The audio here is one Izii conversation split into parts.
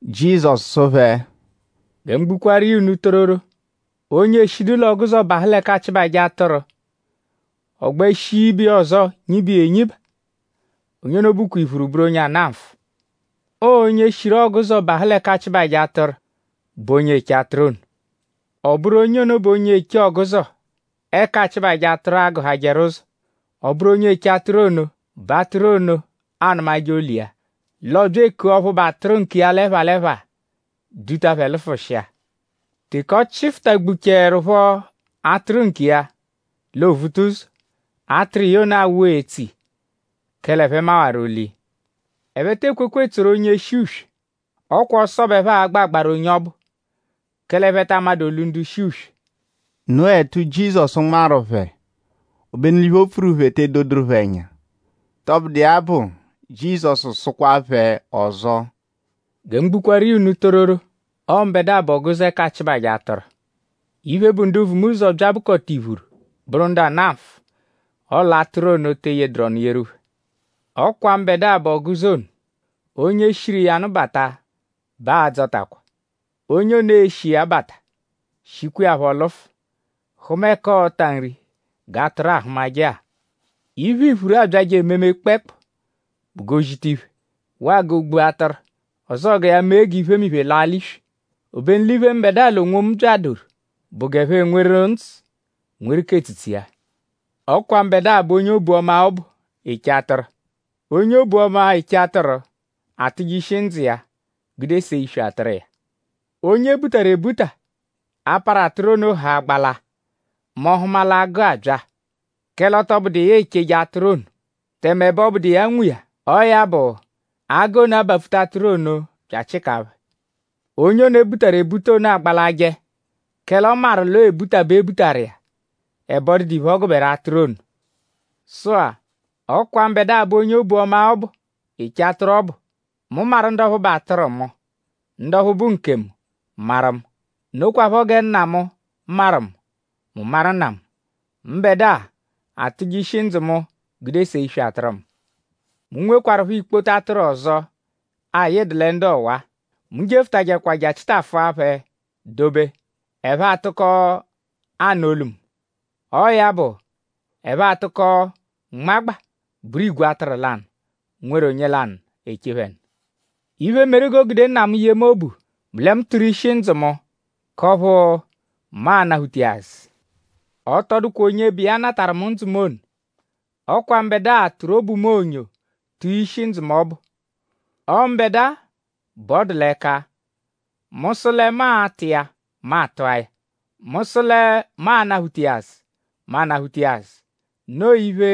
Jizọsu sụ phẹ: “Gẹ mu gbukwaaru iya unu tororo; onye eshidu l'ọguzo bahụ l'ẹka aachịbaje atụru; ọ gbẹ shia ibiya ọzo nyiba iya enyiba; onye ono bụkwa iphuru bụru onye ana nfụ. Ọo onye shiru ọguzo bahụ l'ẹka aachịbaje atụru bụ onye eche atụru ono. Ọ bụru onye ono bẹ onye eche ọguzo ẹka aachịbaje atụru agụhajeru ụzo; ọ bụru onye eche atụru ono bẹ atụru ono anụmaje olu iya; l'ọ bya ekua ọphu bụ atụru nkiya l'ẹpha l'ẹpha; duta phẹ lụfushia. Teke ọ chịfutagbuchaerupho atụru nkiya; l'o vuta ụzo; atụru iya ono awụ etso iya; kẹle ẹphe mawaru olu iya. Ẹphe tee kwekwa etsoru onye shi uswe. Ọ kwa ọso bẹ ẹphe a-gbẹ agbaru onye ọbu; kẹle ẹphe ta amadụ olu ndu shi uswe.” Noo ẹtu, Jizọsu nmarụ phẹ; obenu l'iphe, o pfuru phẹ te edoduru phẹ ẹnya. Tọbudu iya bụ; Jizọsu sụkwa phẹ ọzo: “Gẹ mu gbukwaaru iya unu tororo; ọo mbẹdua bụ ọguzo ẹka aachịbaje atụru. Iphe, bụ ndu vu mu ụzo bya bụkota iphuru; bụru ndu ana nfụ; ọle atụru ono te eyeduru ọnu yeru phẹ. Ọ kwa mbẹdua bụ ọguzo ono. Onye shiru iya nụ bata bẹ aa-dzọtakwa. Onye ono e-shi iya bata; shikwa iya phọ lụfu; hụma ẹka ọo-ta nri g'atụru ahụmaje-a. Iphe, iphuru abyajẹ ememe kpẹekpu bụ g'o zita iphe; waa g'o gbua atụru; ọzoo gẹ ya mee g'iphemiphe laa l'iswi. Obenu l'iphe, mbẹdua l'onwomu byadoru bụ g'ẹphe enweru ndzụ; nweru k'etsutsu iya.” “Ọ kwa mbẹdua bụ onye obu-ọma ọbu, eche atụru. Onye obu-ọma, eche atụru atụje ishi ndzụ iya gude see iswi atụru iya. Onye e butaru ebuta; a-parụ atụru ono haa gbalaa mẹ ọ -hụma l'agụ abya; kẹle ọ tọ bụdu iya echeje atụru ono; tẹme ẹbe ọ bụdu iya nwe iya. Ọo ya bụ; agụ ono abapfuta atụru ono bya achịkaa phẹ. Onye ono, e butaru ebuta ono agbalajẹ; kẹle ọ maru l'ọo ebuta bẹ e butaru iya; ẹbe ọ dụdu iphe, ọ gụberu atụru ono. Sụ-a; ọ kwa mbẹdua bụ onye obu-ọma ọbu, eche atụru ọbu. Mu maru ndu ọphu bụ atụru mu; ndu ọphu bụ nkemu maru mu. Nokwaphọ gẹ Nna mu maru mu; mu maru Nna mu. Mbẹdua atụje ishi ndzụ mu gude see iswi atụru mu. Mu nwekwarụpho ikpoto atụru ọzo, ayịdu lẹ ndu ọwa-a. Mu jefụtajekwa je achịtafua phẹ dobe; ẹphe atụko anụ olu mu. Ọo ya bụ; ẹphe atụko nmagba bụru igwe atụru lanụ; nweru onye lanụ, eche phẹ nụ. “Iphe, meru g'o gude Nna mu yee mu obu bụ lẹ mu tụru ishi ndzụ mu; k'ọphu mu a-nataphu iya azụ. Ọ tọ dụkwa onye bụ iya natarụ mu ndzụ mu ono. Ọ kwa mbẹdua tụru obu mu onyo tụa ishi ndzụ mu ọbu. Ọo mbẹdua bẹ ọ dụ l'ẹka. Mu -sụ lẹ mu a-tụ iya; mu atụa ya. Mu -sụ lẹ mu a-nataphu iya azụ; mu anataphu iya azụ. Noo iphe,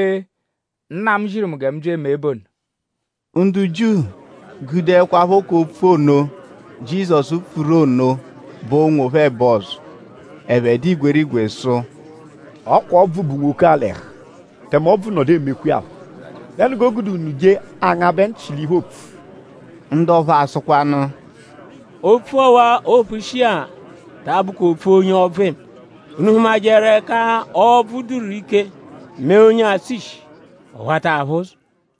Nna mu ziru mu gẹ mu mee bụ ono.” Ndu Jiu gudekwaphọ k'opfu ono, Jizọsu pfuru ono bọo onwophẹ ẹbo ọzo. Ẹphe dụ igwerigwe sụ: “Ọ kwa ọbvu bu nwoke-a l'ẹhu; tẹme ọbvu nọdu emekwa iya phọ.?Dẹnu g'o gude unu je angabẹ nchị l'iphe, oopfu?” Ndu ọphu asụkwanu: “Opfu ọwa-a, oopfushi-a ta abụkwa opfu onye ọbvu eme.?Unu hụmajeru ẹka ọbvu dụru ike mee onye atsụ ishi; ọ wata aphụ ụzo?”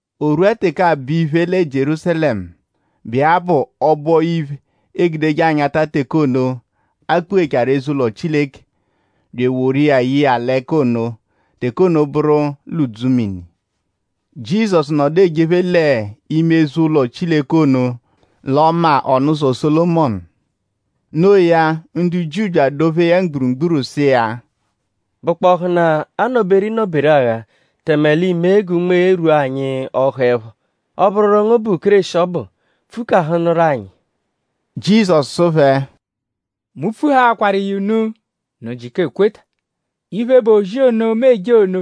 O rwua teke aabọ iphe lẹ Jierúsalẹmu, bụ iya bụ ọbo-iphe, eegudeje anyata teke ono, a kpụ-ghechaaru eze-ụlo Chileke bya eworu iya ye iya l'ẹka ono. Teke ono bụru l'udzumini. Jizọsu nọdu ejephe l'ime eze-ụlo Chileke ono l'ọma Ọnuzo-Sólomọnu. No iya; ndu Jiu bya adọ-phee ya mgburugburu sụ iya: “?Bụkpohunaa a -nọ-beru ịnoberuagha tẹme l'i mee g'unme rwua anyi ọhu-ẹpho? Ọ -bụru ngu bụ Kéreshi ọbu; pfukahụnuru anyi.” Jizọsu sụ phẹ: “Mu pfuhaakwaru iya unu; unu jịka ekweta. Iphe, bụ ozi ono, mu eje ono,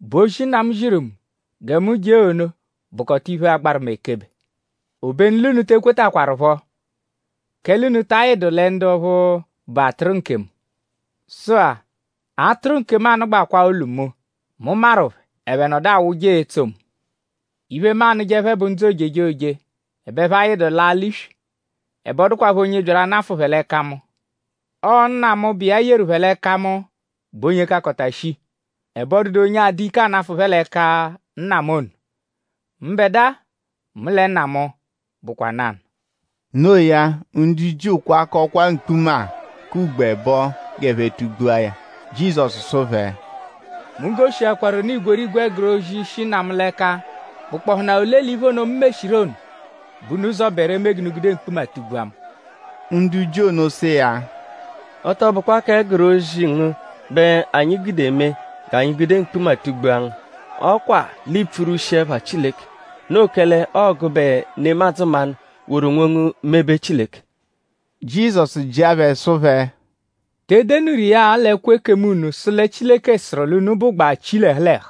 bụ ozi, Nna mu ziru mu gẹ mu jee ono bụkota iphe, agbaru mu ekebe; obenu l'unu te kwetakwarụpho; kẹle unu ta ayịdu lẹ ndu ọphu bụ atụru nkemu. Sụ-a; atụru nkemu anụgbakwaa olu mu; mu maru phẹ; ẹphe nọdu awụje etso mu. Iphe, mu anụje phẹ bụ ndzụ ojejoje; ẹbe ẹphe ayịdu laa l'iswi; ẹbe ọ dụkwapho onye byaru anafụ phẹ l'ẹka mu. Ọo Nna mu, bụ iya yeru phẹ l'ẹka mu bụ onye kakọta shii; ẹbe ọ dụdu onye adụ ike anafụ phẹ l'ẹka Nna mu ono. Mbẹdua mu lẹ Nna mu bụkwa nanụ.” No iya; ndu Jiu kwakọkwaa mkpuma k'ugbo ẹbo g'ẹphe tugbua ya. Jizọsu sụ phẹ: “Mu goshiakwaru unu igwerigwe ẹguru ozi, shi Nna mu l'ẹka.?Bụkpohunaa ole l'iphe ono, mu meshiru ono bẹ unu zọberu eme g'unu gude mkpuma tugbua mu?” Ndu Jiu ono sụ iya: “Ọ tọ bụkwa k'ẹguru ozi ngu bẹ anyi gude eme g'anyi gude mkpuma tugbua ngu. Ọ kwa l'iipfurwushi ẹpha Chileke. Noo kẹle ọo gụbe nemadzụ mmanụ woru onwongu mebe Chileke.” Jizọsu jịa phẹ sụ phẹ: “?Te denuru iya-a l'ẹkwo ekemu unu sụ lẹ Chileke sụru l'unu bụgbaa chi l'ẹhu l'ẹhu.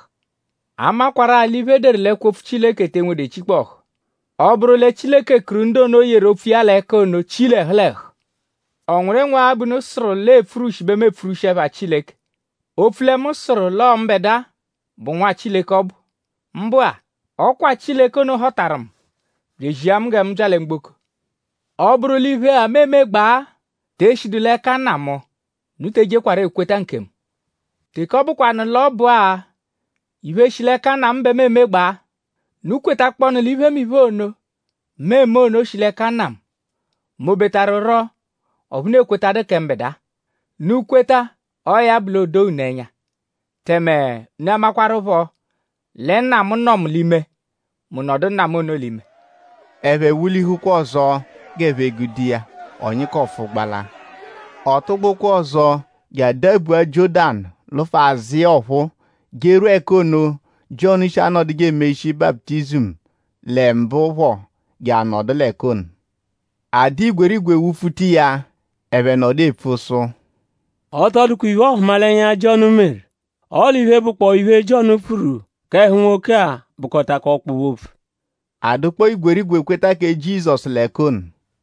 A makwarụ-a l'iphe, e deru l'ẹkwo-opfu Chileke te enwedu echikpọhu. Ọ -bụru lẹ Chileke kuru ndu ono, o yeru opfu iya l'ẹka ono chi l'ẹhu l'ẹhu; ?ọ nwụru ịnwu-agha bẹ unu sụru l'ọo epfurwushi bẹ mu epfurwushi ẹpha Chileke; opfu lẹ mu sụru l'ọo mbẹdua bụ Nwa Chileke ọbu? Mbụ-a; ọ kwa Chileke ono họtaru mu; bya ezia mu gẹ mu bya lẹ mgboko. Ọ -bụru l'iphe-a, mu emegbaa te eshidu l'ẹka Nna mu; unu te ejekwarọ ekweta nkemu. Teke ọ bụkwanu l'ọ bụ-a iphe, shi l'ẹka Nna mu bẹ mu emegbaa; unu kwetakpọnu l'iphemiphe ono, mu eme ono shi l'ẹka Nna mu; m'ọ betarụro ọphu unu ekwetadu kẹ mbẹdua. Unu -kweta; ọo ya bụ l'o doo unu ẹnya; tẹme unu amakwarụpho lẹ Nna mu nọ mu l'ime; mu nọdu Nna mu ono l'ime.” Ẹphe wụ-lihukwa ọzo g'ẹphe gude iya; ọ nyịkofu gbala. Ọ tụgbukwaa ọzo je adabua Jiọ́danu lụfu azụ iya ọphuu jerwua ẹka ono, Jiọnu shi anọduje emeshi baputizimu lẹ mbụ phọ je anọdu l'ẹka ono. A dụ igwerigwe wụ-pfuta iya. Ẹphe nọdu epfu sụ: “Ọ tọ dụkwa iphe-ọhumalenya, Jiọnu meru; ọle iphe, bụkpoo iphe Jiọnu pfuru k'ẹhu nwoke-a bụkotakwa ọkpobe-opfu.” A dụkpoo igwerigwe kweta kẹ Jizọsu l'ẹka ono.